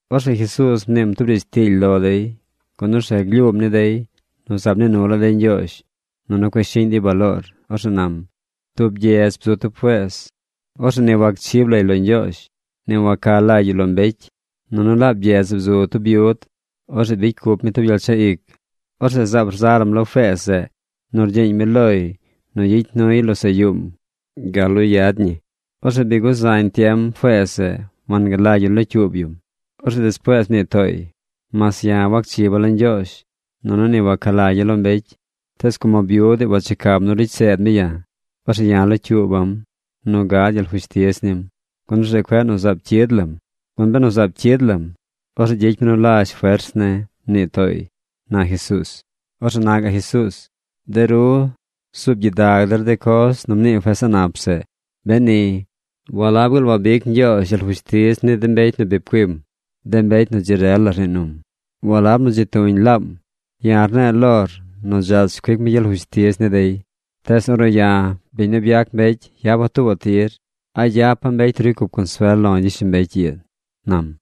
Orzeꞌ Jesuuz mniim tub riidz tiily lo dey, gun orzeꞌ glyuum ni dey nu zaab nii nu laa dey Ñgyoozh, nunu cueꞌ shiꞌñ dey baloor. Orzeꞌ nam: ―Tub gyedz bzu tub feez. Orzeꞌ ni wanchib lay lo Ñgyoozh, ni wanca lagy yu lo mbecy. Nunu laab gyedz zeꞌ bzu tub byud. Orzeꞌ bicy cup mi tub gyel chaꞌ ic. Orzeꞌ zaab rza lam lo feez zeꞌ nu rgyiiñ mi loy nu gyicy nuy losaꞌ yuum gal nu yad ñi. Orzeꞌ bi guzañ tiem feez zeꞌ wangalagy yu locyuub yum. Orzeꞌ despuees mnii tooy: “Mas ya̱ wacchiba̱ lo Ñgyoozh nunu ni waca lagya̱ lo mbecy, tees como byud ii wachecam nu ricy seed mi ya̱, orzeꞌ ya̱ locyuuba̱m nu gad gyel fushtiz nim, gun orzeꞌ cueꞌ nu zaab cyid lam. Gun benu zaab cyid lam, orzeꞌ gyicy mi nu lazh fers ne̱”, mnii tooy ―na Jesuuz. Orzeꞌ na gaꞌ Jesuuz: ―De ru zuub gyidag der de coz nu mnii feez a̱ꞌ nap zeꞌ. Beni, ¿walab gaal wabic Ñgyoozh gyel fushtiz ni de mbecy nu bi pcuim, de mbecy nu dzi rel la rnii num? Walab nu dzi tuñ laam. Ya̱ rne̱e̱ lor nu dzach cuic mi gyel fushtiz ni dey. Tees ornu ya̱, biñ nu byac mbecy, yapa̱ tuubaꞌ tir, ¿a gyapa̱ mbecy nu ricy cup consuel lo̱ gyishlombecy ii? ―nam.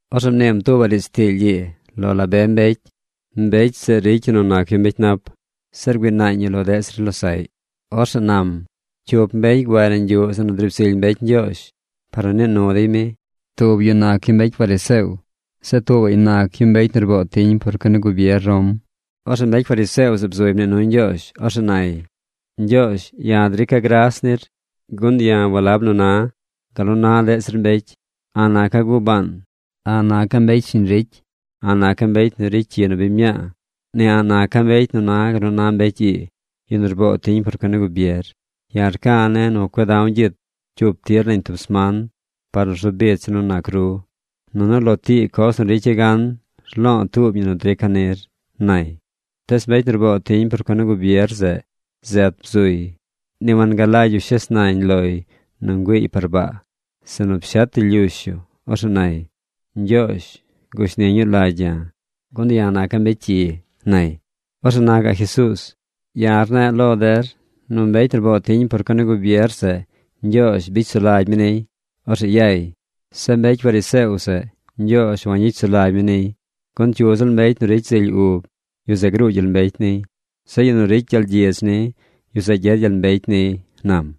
Orzeꞌ mniim tuubaꞌ riidz tiily ii lo la be mbecy nu ricy nu nac mbecy nap, zeꞌ rgüii naañ yu lo deꞌ zir losaꞌy. Orzeꞌ nam: ―Cyup mbecy guay nañ yuꞌ zeꞌ nu driib zily mbecy Ñgyoozh par nu nii nu dey mi. Tub yu nac yu tub mbecy fariseo. Zeꞌ tuubaꞌy nac yu tub mbecy nu rboo tiñ por cuen ni gubier Rom. Orzeꞌ mbecy fariseo zeꞌ bzuy mnii nuy Ñgyoozh. Orzeꞌ nay: “Ñgyoozh, ya̱ rica̱ gras nir, gun ya̱ walab nu na̱ gal nu na deꞌ zir mbecy. A̱ꞌ naca̱ gubaan. A̱ꞌ naca̱ mbecy shiñ ricy. A̱ꞌ naca̱ mbecy nu ricy cyi nu biñ mñaa. Ni a̱ꞌ naca̱ mbecy nu na gal nu na mbecy ii, yu nu rboo tiñ por cuen ni gubier. Ya̱ rca̱ ne̱ nu cueꞌ da̱w gyit cyup tir nañ tub sman par nu rzu bicha̱ nu nac ru. Nunu lo tii coz nu ricya̱ gan, rlo̱o̱ tuub ñi nu drica̱ nir”, nay. Tees mbecy nu rboo tiñ por cuen ni gubier zeꞌ zet bzuy. Ni wangalagy yu shes nañ loy nu güiiy par baa, sinu pshet yu lyush yu. Orzeꞌ nay: “¡Ñgyoozh, gushni ñuu lagy ya̱, gun ya̱ naca̱ mbecy cyi!” nay. Orzeꞌ na gaꞌ Jesuuz: ―Ya̱ rne̱e̱ lo der nu mbecy nu rboo tiñ por cuen ni gubier zeꞌ, Ñgyoozh bicy sulagy mi niy. Orzeꞌ yay. Zeꞌ mbecy fariseo zeꞌ, Ñgyoozh wangyicy sulagy mi niy. Gun cyu ziꞌl mbecy nu ricy zily ub yu, yu zeꞌ gruu gyel mbecy niy. Zeꞌ yu nu ricy gyel gyidz ni, yu zeꞌ gyed gyel mbecy niy ―nam.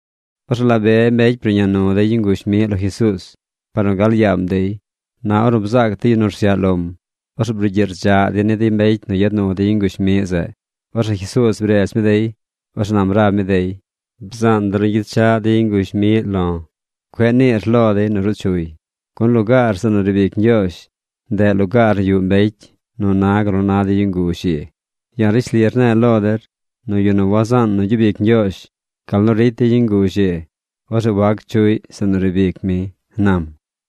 Orzeꞌ la be mbecy bruꞌña nu dey yu nguzh miꞌ lo Jesuuz par nu gal yaam dey. Na ornu bzaac de yu nu rsyaꞌ lom, orzeꞌ brugyiꞌ rdzaꞌ dey ni de mbecy nu yad nu de yu nguzh miꞌ zeꞌ. Orzeꞌ Jesuuz bredz mi dey. Orzeꞌ nam rab mi dey: ―Bzaan der nu gyechaꞌ de yu nguzh miꞌ lo̱. Cueꞌ niir lo dey nu ruu chuy. Gun lugaar zeꞌ nu riib ic Ñgyoozh, ndeꞌ lugaar nu yuꞌ mbecy nu na gal nu na de yu nguzh ii. Ya̱ rishli rne̱e̱ lo der nu yu nu wazaan nu gyub ic Ñgyoozh gal nu ricy de yu nguzh ii, orzeꞌ wac chuꞌy zeꞌ nu riib ic mi ―nam.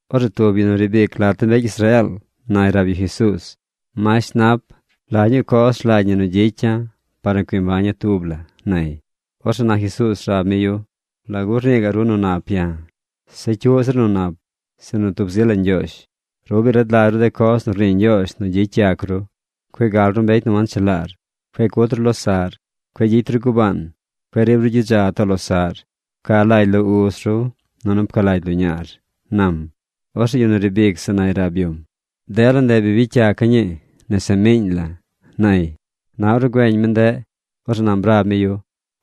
Orzeꞌ tub yu nu riib ic lat de mbecy Israeel nay rab yu Jesuuz: ―Masht nap, ¿la ñuu coz rlagy ñi nu gyicya̱ par nu cui mbaña̱ tub la? ―nay. Orzeꞌ na Jesuuz rab mi yu: ―¿Lagu rnii gaꞌ ru nu nap ya̱? Zeꞌ cyu zir nu nap, sinu tub zi la Ñgyoozh. Ru bi rad lagy ru de coz nu rnii Ñgyoozh nu gyicy yac ru. Cueꞌ gal ru mbecy nu wanchelaar. Cueꞌ cut ru losaꞌr. Cueꞌ gyicy ru gubaan. Cueꞌ riib ru gyidza too losaꞌr. Pca lagy lo uz ru, nunu pca lagy lo ñaar ―nam. Orzeꞌ yu nu riib ic zeꞌ nay rab yum: ―Dela ndeꞌ bi bicy yaca̱ ñi nese miiñ la̱ ―nay. Na ornu güeñ mi ndeꞌ, orzeꞌ nam rab mi yu: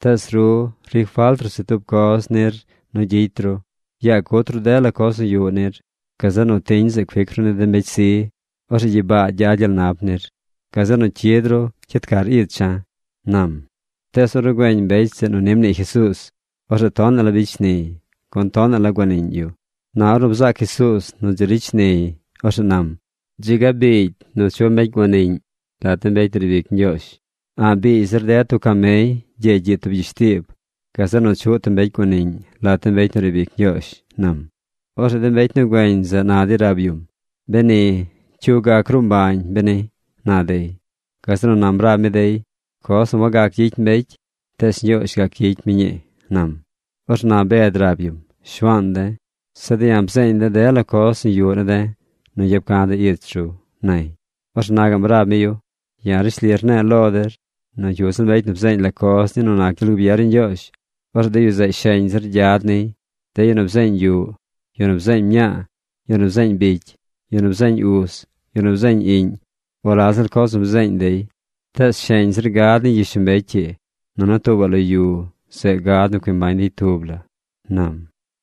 ―Tees ru ricy falt se tub coz nir nu gyicy ru. Yaa cut ru dela coz nu yuꞌ nir. Gazeꞌ nu tiñ zeꞌ cuic ru ni de mbecy zi. Orzeꞌ gyibaa gyad gyel nap nir. Gazeꞌ nu cyid ru cyid car icha̱ ―nam. Tees ornu güeñ mbecy zeꞌ nu ni mnii Jesuuz, orzeꞌ tonaꞌ la bicy shniy, gun tonaꞌ la guaniꞌñ yu. Na ornu bzaac Jesuuz nu dzi ricy shniy, orzeꞌ nam: ―¡Dzi ga biigy nu chuꞌ mbecy guaniꞌñ lat de mbecy nu riib ic Ñgyoozh! A̱ꞌ biigy zir ded tub camey gyeegy gyiꞌ tub gyishtiib, gazeꞌ nu chuꞌ tub mbecy guaniꞌñ lat de mbecy nu riib ic Ñgyoozh ―nam. Orzeꞌ de mbecy nu güeñ zeꞌ na dey rab yum: ―Beni, ¿cyu gac gruu mbañ, beni? ―na dey. Gazeꞌ nu nam rab mi dey: ―Coz nu wagac gyicy mbecy, tees Ñgyoozh gac gyicy mi ñii ―nam. Orzeꞌ na Bed rab yum: ―Shuaan de̱, de̱ ya̱ bzeeñ de̱ dela coz nu yuꞌ ne̱ de̱ nu yap ca̱ de̱ ich ru ―nay. Orzeꞌ na gaꞌm rab mi yu: ―Ya̱ rishli rne̱e̱ lo der nu cyu ziꞌl mbecy nu bzeeñ la coz ni nu nac gyel gubier ni Ñgyoozh, orzeꞌ de yu zeꞌ sheñ zir gyad niy. De yu nu bzeeñ yuꞌ, yu nu bzeeñ mñaa, yu nu bzeeñ bicy, yu nu bzeeñ uz, yu nu bzeeñ iꞌñ, o la ziꞌl coz nu bzeeñ dey, tees sheñ zir gad niy gyishlombecy ii, nunu tuubaꞌ lo yu zeꞌ gad nu cui mbañ yu tub la ―nam.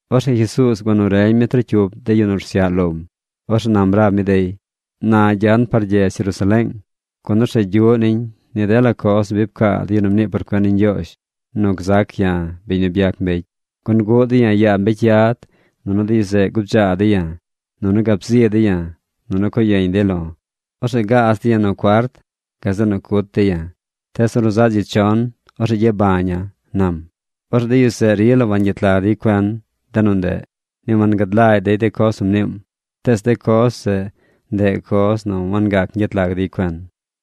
Orzeꞌ Jesuuz gua nu reñ mi trocyup de yu nu rsyaꞌ lom. Orzeꞌ nam rab mi dey: ―Na gyan par gyedz Jerusaleeng, gun orzeꞌ gyuꞌ niñ ni dela coz nu pcaa de yu nu mnii por cuen ni Ñgyoozh nu gzac ya̱, biñ nu byac mbecy. Gun guꞌ dey ya̱ yaa mbecy yad. Nunu de yu zeꞌ gubdzaa dey ya̱. Nunu gab zi dey ya̱. Nunu co yeñ dey lo̱. Orzeꞌ gaaz dey ya̱ nu cuart. Gazeꞌ nu cut dey ya̱. Tees ornu zaꞌ dzi chon, orzeꞌ gyabaña̱ ―nam. Orzeꞌ de yu zeꞌ rila wangyet lag dey cuen de nu ndeꞌ. Ni wangad lagy dey de coz nu mniim. Tees de coz zeꞌ, ndeꞌ coz nu wangac gyet lag dey cuen.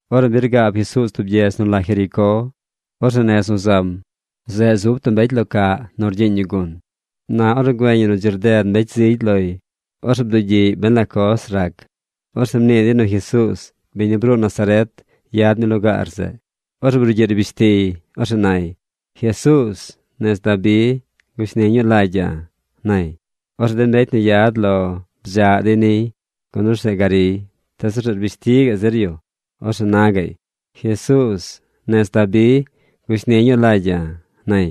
Ornu bi rgaab Jesuuz tub gyedz nu la Jericó, orzeꞌ nez nu zam, zeꞌ zub tub mbecy lo caꞌ nu rgyiiñ yu gun. Na ornu güeñ yu nu dzi rded mbecy zigy loy, orzeꞌ bdugyiꞌy ben la coz rac. Orzeꞌ mnii dey nu Jesuuz, biñ nu bruu Nazaret, yad mi lugaar zeꞌ. Orzeꞌ brugyiꞌ rbish tiy. Orzeꞌ nay: ―¡Jesuuz, nez Dabi, gushni ñuu lagya̱! ―nay. Orzeꞌ de mbecy nu yad lo bdzaꞌ dey niy, gun orzeꞌ gariy. Tees orzeꞌ rbish ti gaꞌ zir yu. Orzeꞌ na gaꞌy: ―¡Jesuuz, nez Dabi, gushni ñuu lagya̱! ―nay.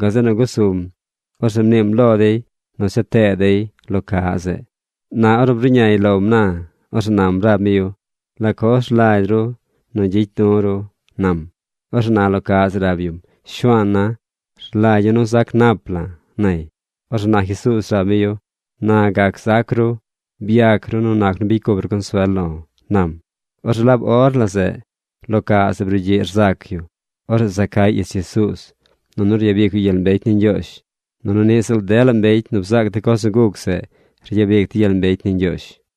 Gazeꞌ nu gusum. Orzeꞌ mniim lo dey nu cha tee dey lo ca zeꞌ. Na ornu bruꞌñay lom na, orzeꞌ nam rab mi yu: ―¿La coz rlagy ru gyicy du̱ ru? ―nam. Orzeꞌ na lo caꞌ zeꞌ rab yum: ―Shuaana̱, rlagya̱ nu zac nap la̱ ―nay. Orzeꞌ na Jesuuz rab mi yu: ―¡Na gac gzac ru! Byac ru nu nac nu bicy cup ru consuel lo̱ ―nam. Orzeꞌ laab or la zeꞌ lo caꞌ zeꞌ brugyiꞌ rzac yu. Orzeꞌ za cay ich Jesuuz, nunu ryabic yu gyel mbecy ni Ñgyoozh. Nunu niꞌ ziꞌl dela mbecy nu bzaac de coz nu guc zeꞌ ryabic dey gyel mbecy ni Ñgyoozh.